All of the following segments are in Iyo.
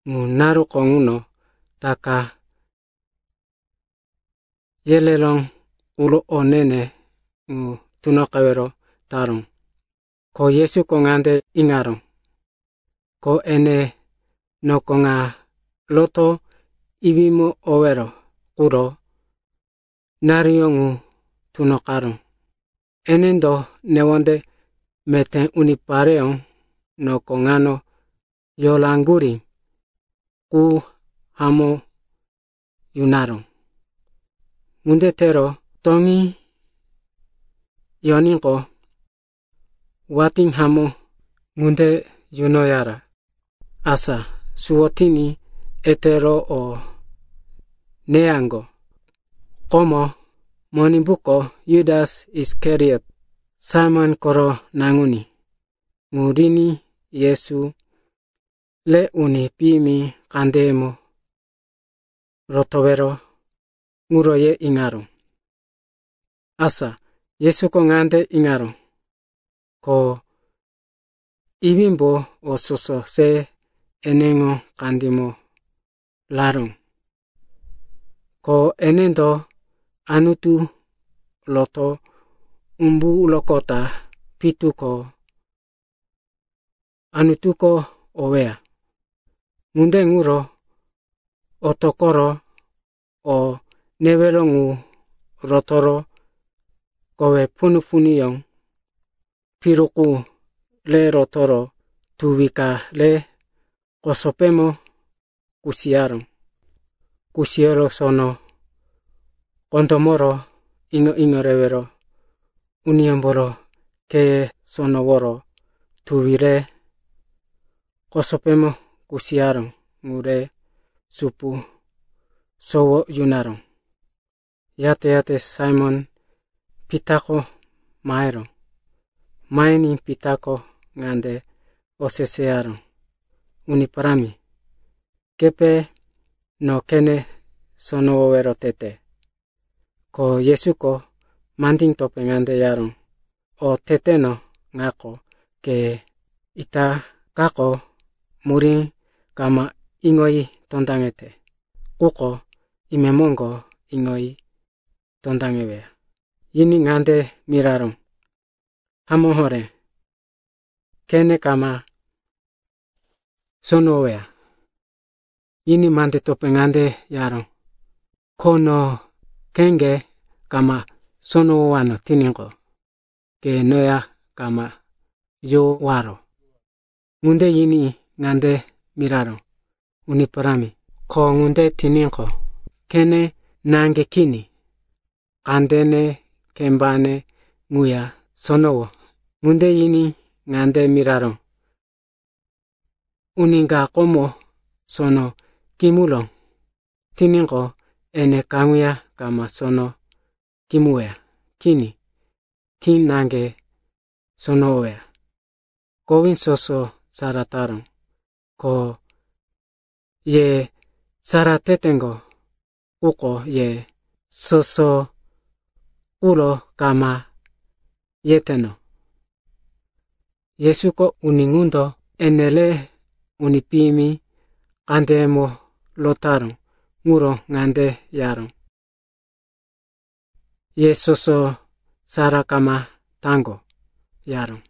Ŋu naruko ŋuno Taka yereró quro o ne-ne ŋu tunoqewero taró. Ko Yesuko ŋande iŋaró, ko ene noko ŋa rotoro Iwímo owero quro naruyó ŋu tunoqaró. Enendo newonde meté unipareyó noko ŋano yoraŋgurí qu hamó yunoyaró. Ŋunde tero toŋí yoníqo, watí hamó ŋunde yunoyara. Asa suwo tiní etero o neyaŋgo. Komo Monimbuko Jutas Isikariot, Saimon koro naŋuní ŋu riní Yesu re uni piyimi kandeyemo rotowero ŋuro ye iŋaró. Asa Yesuko ŋande iŋaró, ko Iwímbo o soso se eneŋo kandímo raró, ko enendo Anutu roto umburoqota pitu ko Anutuko oweya. Ŋunde ŋuro otoqoro o newero ŋu rotoro kowe punu-punuyó piru qu re rotoro tuwi ka re kosopémo kusiyaró. Kusiyoro sono kondómoro iŋo-iŋo rewero uniyómboro kheye sonoworo tuwi re kosopímo kusiyaró ŋu re supu sowo yunaró. Yate-yate Saimon-Pitako maheró. Mahiní Pitako ŋande oseseyaró, “Uni Parámi, kepe no khene sonowowero tete?” Ko Yesuko mandí topé ŋande yaró, “O teteno ŋako, ke itakako murí kama iŋoyi tondaŋete. Quko imemoŋgo iŋoyi tondaŋeweya.” Yiní ŋande miraró, “Hamó horé, khene kama sonowoweya!” Yiní mande topé ŋande yaró, “Ko no kheŋge kama sonowowano tiníqo, ke noya kama yowaro.” Ŋunde yiní ŋande miraró, “Uni Parámi, ko ŋunde tiníqo, khene naŋge kini, kandene, kembane ŋuya sonowo.” Ŋunde yiní ŋande miraró, “Uni ka komo sono kimuró tiníqo, ene kaŋuya kama sono kimuweya. Kini, khí naŋge sonowoweya, kowí soso sara taró. Ko ye sara teteŋgo. Quko ye soso quro kama yeteno.” Yesuko uni ŋundo ene re uni piyimi kandeyemo rotaró ŋuro ŋande yaró, “Ye soso sara kama taŋgo,” yaró.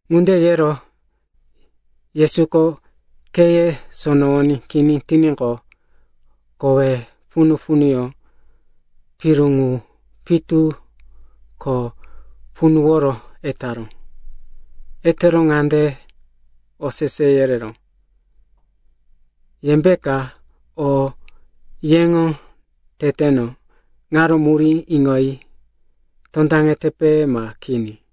Ŋunde yero Yesuko kheye sonowoní kini tiníqo, kowe punu-punuyó piru ŋu pitu ko punuworo etaró. Etero ŋande osese yereró, “Yembeka o yeŋo teteno ŋaro murí iŋoyi tondaŋetepe ma kini?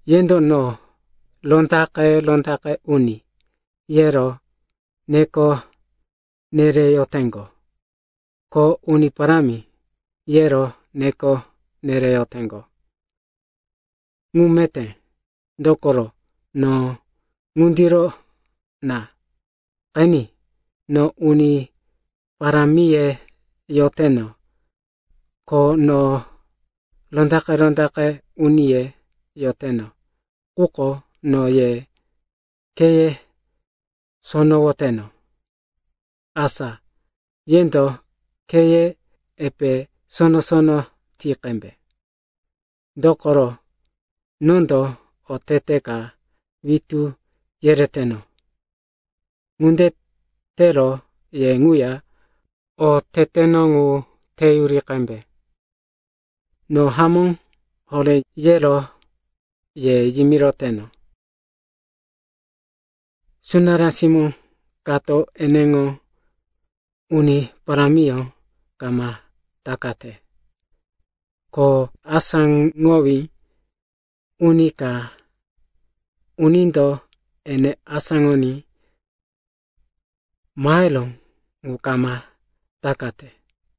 Yendo no, ‘Rondaqe-rondaqe Uni,’ yero neko nereyoteŋgo, ko, ‘Uni Parámi,’ yero neko nereyoteŋgo. Ŋu meté, dokoro no ŋundiro na. Qeni, no Uni Parámiye yoteno, ko no Rondaqe-rondaqe Uniye yoteno, quko no ye kheye sonowoteno. Asa yendo kheye epe sono-sono ti qembe. Dokoro nondo otete ka witú yereteno. Ŋunde tero ye ŋuya o teteno ŋu teyuri qembe. No hamó horé yero ye yimiroteno, sunará simó kato eneŋo uni parámiyó kama takate. Ko asáŋowí uni ka unindo ene asáŋoní maheró ŋu kama takate.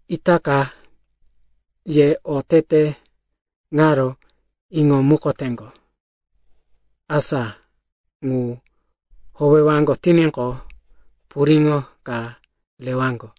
Itaka ye otete ŋaro iŋomukoteŋgo, asa ŋu howewaŋgo tiníqo, puriŋo ka rewaŋgo.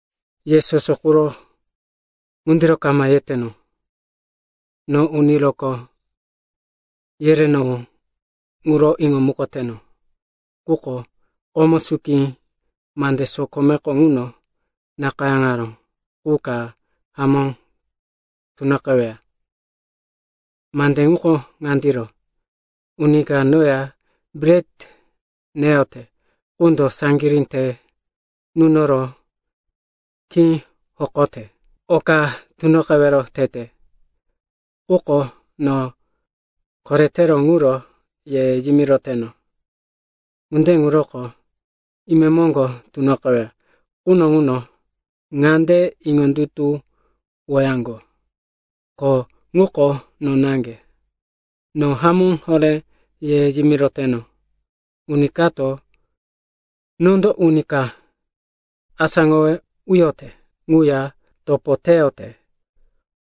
“Ye soso quro ŋundiro kama yeteno. No uni rokó yerenowó ŋuro iŋomukoteno. Quko komo suki mande sokomeko ŋuno nakayáŋaró qu ka hamó tunoqeweya. Mande ŋuko ŋandiro, ‘Uni ka noya bret neyote qundo saŋgirí te nunoro khí hokote.’ “Oka tunoqewero tete, quko no koretero ŋuro ye yimiroteno. Ŋunde ŋuroko imemoŋgo tunoqeweya quno ŋuno ŋande iŋondutuwowaŋgo, ko ŋuko no naŋge. No hamó horé ye yimiroteno, uni kato nondo uni ka asáŋowe uyote ŋuya topo teyote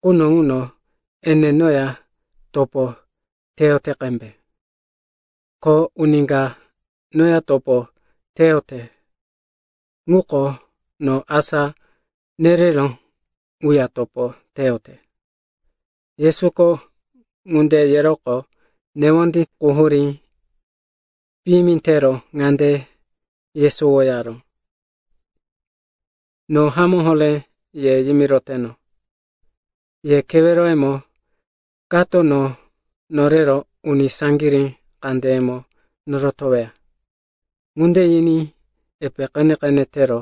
quno ŋuno ene noya topo teyote qembe. Ko uni ka noya topo teyote ŋuko no asá nereró ŋuya topo teyote.” Yesuko ŋunde yeroqo newondí quhurí piyimi tero ŋande yesowo yaró, “No hamó horé ye yimiroteno, ye keweroyemo kato no norero uni saŋgirí kandeyemo norotoweya.” Ŋunde yiní epe qene-qene tero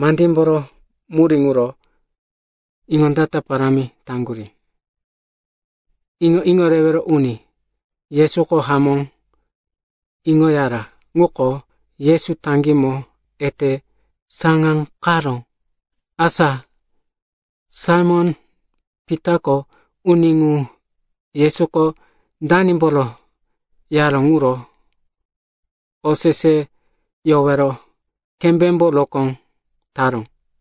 mandímboro murí ŋuro iŋondata parámi taŋgurí. Iŋo-iŋo rewero uni Yesuko hamó iŋoyara ŋuko Yesu taŋgímo ete saŋáqaró. Asa Saimon-Pitako uni ŋu Yesuko danimboro yaró ŋuro oseseyowero kembémbo rokó taró.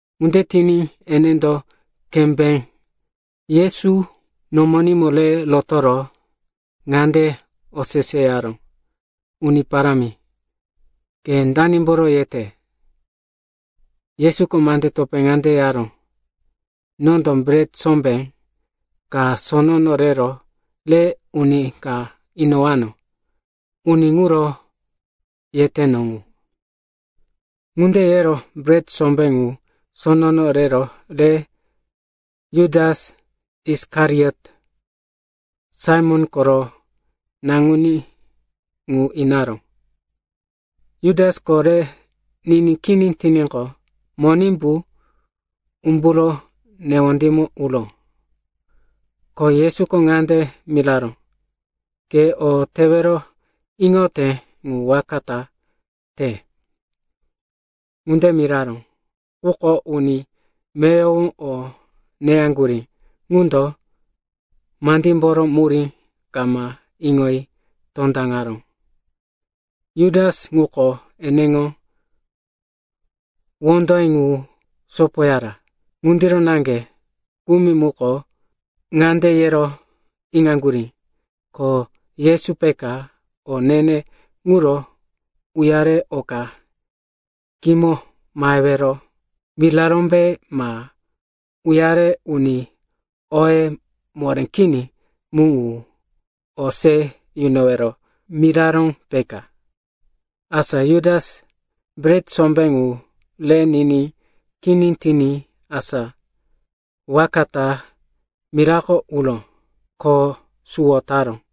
Ŋunde tiní enendo kembé Yesu nomonímo re rotoro ŋande oseseyaró, “Uni Parámi, ke danimboro yete?” Yesuko mande topé ŋande yaró, “Nondo bret sombé ka sonono rero re uni ka inowano. Uni ŋuro yeteno ŋu.” Ŋunde yero bret sombé ŋu sonono rero re Jutas Isikariot, Saimon koro naŋuní, ŋu inaró. Jutasko re niní kini tiníqo, Monimbu umburo newondímo uró. Ko Yesuko ŋande miraró, “Ke o tewero iŋote ŋu waka ta te.” Ŋunde miraró, quko uni meyowo o neyaŋgurí ŋundo mandímboro murí kama iŋoyi tondaŋaró. Jutas ŋuko eneŋo wondoye ŋu sopoyara. Ŋundiro naŋge kumi muko ŋande yero iŋaŋgurí, ko Yesu peka o ne-ne ŋuro uyare oka kimo mahewero mirarómbe, ma uyare uni oye moré kini mu ŋu o se yunowero miraró, peka. Asa Jutas bret sombé ŋu re niní kini tiní asa waka ta mirako uró. Ko suwo taró.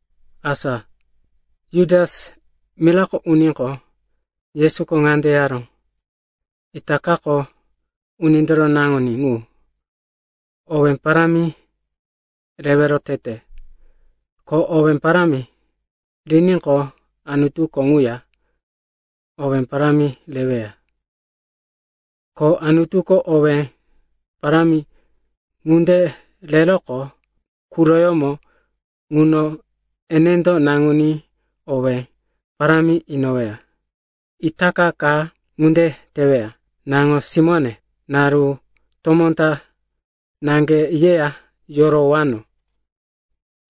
Asa Jutas mirako uníqo, Yesuko ŋande yaró, “Itakako Unindoro Naŋuní ŋu owé parámi rewero tete. Ko owé parámi riníqo, Anutuko ŋuya owé parámi reweya. Ko Anutuko owé parámi ŋunde reroqo quroyómo ŋuno enendo Naŋuní owé parámi inoweya. Itaka ka ŋunde teweya. “Naŋo-simóne, naru tomó ta naŋge yeya yorowano.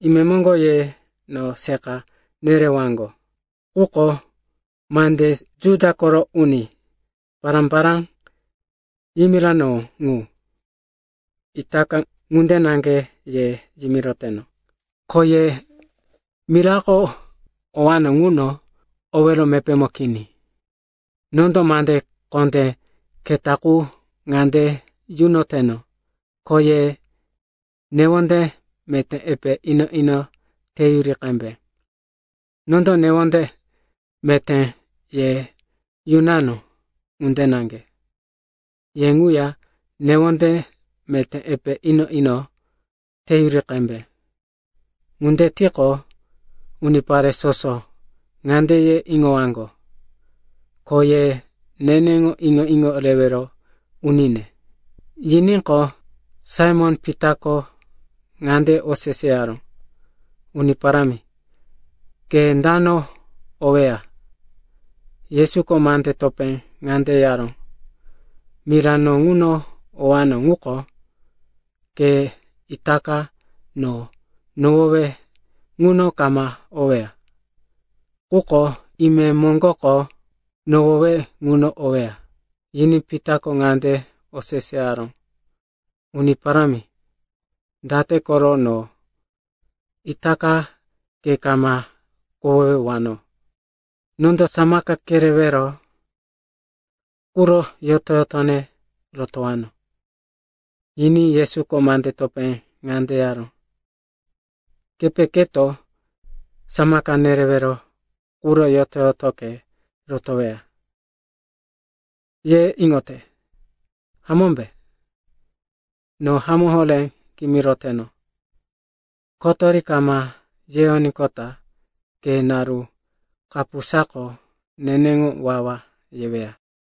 Imemoŋgo ye no seqa nerewaŋgo. Quko mande Juda koro uni pará-pará yimiranowó ŋu, itaka ŋunde naŋge ye yimiroteno, ko ye mirako owano ŋuno owero mepémo kini. “Nondo mande kondé keta qu ŋande yunoteno, ko ye newonde meté epe ino-ino teyuri qembe. Nondo newonde meté ye yunano ŋunde naŋge, ye ŋuya newonde meté epe ino-ino teyuri qembe. Ŋunde tiqo, unipare soso ŋande ye iŋowaŋgo, ko ye neneŋo iŋo-iŋo rewero unine.” Yiníqo, Saimon-Pitako ŋande oseseyaró, “Uni Parámi, ke dano oweya?” Yesuko mande topé ŋande yaró, “Mira no ŋuno owano ŋuko, ke itaka no nohowe ŋuno kama oweya. Quko imemoŋgoko nohowe ŋuno oweya.” Yiní Pitako ŋande oseseyaró, “Uni Parámi, date koro no itaka ke kama kohowewano? Nondo samaka kerewero quro yoto-yotone rotowano.” Yiní Yesuko mande topé ŋande yaró, “Kepe keto samaka nerewero quro yoto-yotoke rotoweya, ye iŋote, hamómbe? No hamó horé kimiroteno, kotori kama yeyoníqota ke naru kapusako neneŋo wawa yeweya.